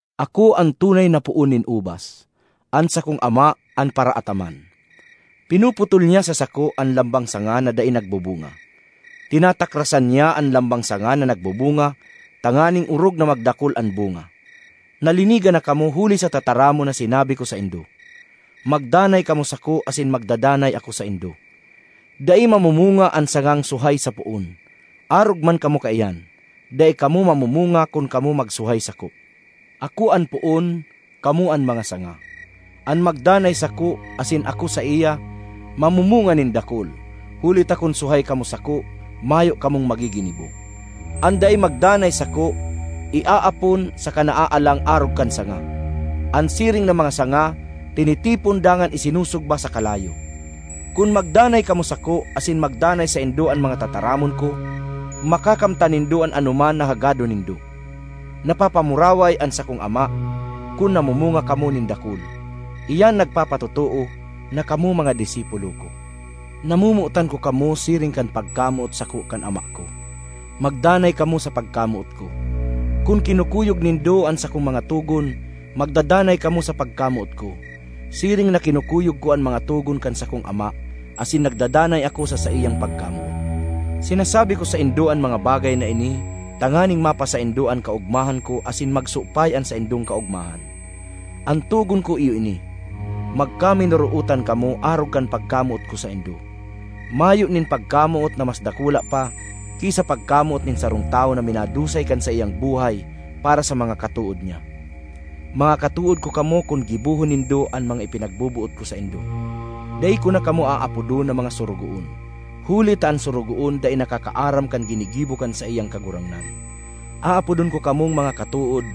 ”Ako an tunay na poon nin ubas; an sakong Ama an paraataman. Pinuputol niya sa sako an lambang sanga na dai nagbubunga; tinatakrasan niya an lambang sanga na nagbubunga tanganing orog na magdakul an bunga. Nalinigan na kamo huli sa tataramon na sinabi ko saindo. Magdanay kamo sako asin magdadanay ako saindo. Dai mamumunga an sangang suhay sa poon. Arog man kamo kaiyan; dai kamo mamumunga kun kamo magsuhay sako. ”Ako an poon, kamo an mga sanga. An magdanay sako, asin ako saiya, mamumunga nin dakul; huli ta kun suhay kamo sako, mayo kamong magiginibo. An dai magdanay sako iaapon saka naaalang arog kan sanga. An siring na mga sanga tinitipon dangan isinusugba sa kalayo. Kun magdanay kamo sako, asin magdanay saindo an mga tataramon ko, makakamtan nindo an anoman na hagadon nindo. Napapamuraway an sakong Ama kun namumunga kamo nin dakul; iyan nagpapatotoo na kamo mga disipulo ko. Namomotan ko kamo siring kan pagkamoot sako kan Ama ko; magdanay kamo sa pagkamoot ko. Kun kinukuyog nindo an sakong mga togon, magdadanay kamo sa pagkamoot ko, siring na kinukuyog ko an mga togon kan sakong Ama asin nagdadanay ako sa saiyang pagkamoot. ”Sinasabi ko saindo an mga bagay na ini tanganing mapasaindo an kaogmahan ko asin magsupay an saindong kaogmahan. An togon ko iyo ini: magkaminorootan kamo arog kan pagkamoot ko saindo. Mayo nin pagkamoot na mas dakula pa ki sa pagkamoot nin sarong tawo na minadusay kan saiyang buhay para sa mga katood niya. Mga katood ko kamo kun gibohon nindo an mga ipinagboboot ko saindo. Dai ko na kamo aapodon na mga sorogoon, huli ta an sorogoon dai nakakaaram kan ginigibo kan saiyang kagurangnan. Aapodon ko kamong mga katood,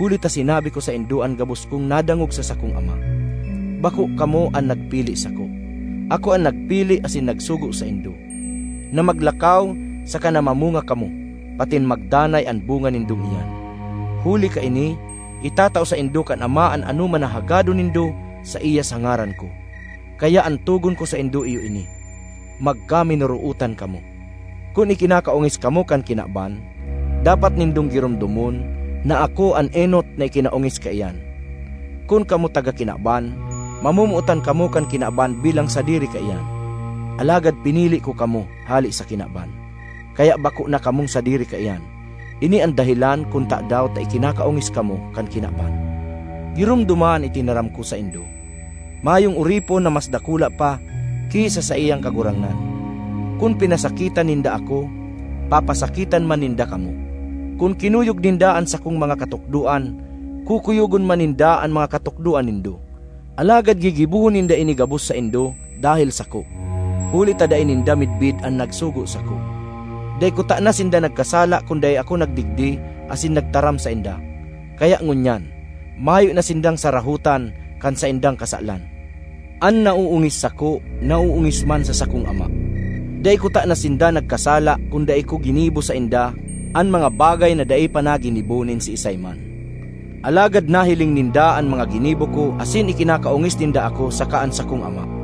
huli ta sinabi ko saindo an gabos kong nadangog sa sakong Ama. Bako kamo an nagpili sako; ako an nagpili asin nagsugo saindo na maglakaw saka na mamunga kamo, patin magdanay an bunga nindong iyan. Huli kaini, itatao saindo kan Ama an anoman na hagadon nindo saiya sa ngaran ko. Kaya an togon ko saindo iyo ini: magkaminorootan kamo. ”Kun ikinakaongis kamo kan kinaban, dapat nindong giromdomon na ako an enot na ikinaongis kaiyan. Kun kamo taga kinaban, mamomotan kamo kan kinaban bilang sadiri kaiyan. Alagad pinili ko kamo hale sa kinaban, kaya bako na kamong sadiri kaiyan; ini an dahelan kun tadaw ta ikinakaongis kamo kan kinaban. Giromdoma an itinaram ko saindo: ‘Mayong oripon na mas dakula pa ki sa saiyang kagurangnan.’ Kun pinasakitan ninda ako, papasakitan man ninda kamo; kun kinuyog ninda an sakong mga katukdoan, kukuyogon man ninda an mga katukdoan nindo. Alagad gigibohon ninda ini gabos saindo dahel sako, huli ta dai ninda midbid an nagsugo sako. Dai kutana sinda nagkasala kun dai ako nagdigdi asin nagtaram sainda. Kaya ngunyan, mayo na sindang sarahotan kan saindang kasalan. An naoongis sako naoongis man sa sakong Ama. Dai kutana sinda nagkasala kun dai ko ginibo sainda an mga bagay na dai pa naginibo nin siisay man. Alagad nahiling ninda an mga ginibo ko asin ikinakaongis ninda ako saka an sakong Ama.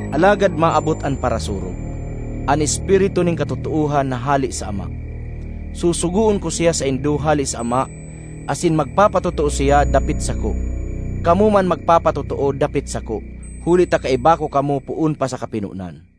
”Alagad maabot an Parasurog, an Espiritu nin katotoohan na hale sa Ama. Susugoon ko siya saindo hale sa Ama asin magpapatotoo siya dapit sako. Kamo man magpapatotoo dapit sako, huli ta kaiba ko kamo poon pa sa kapinonan.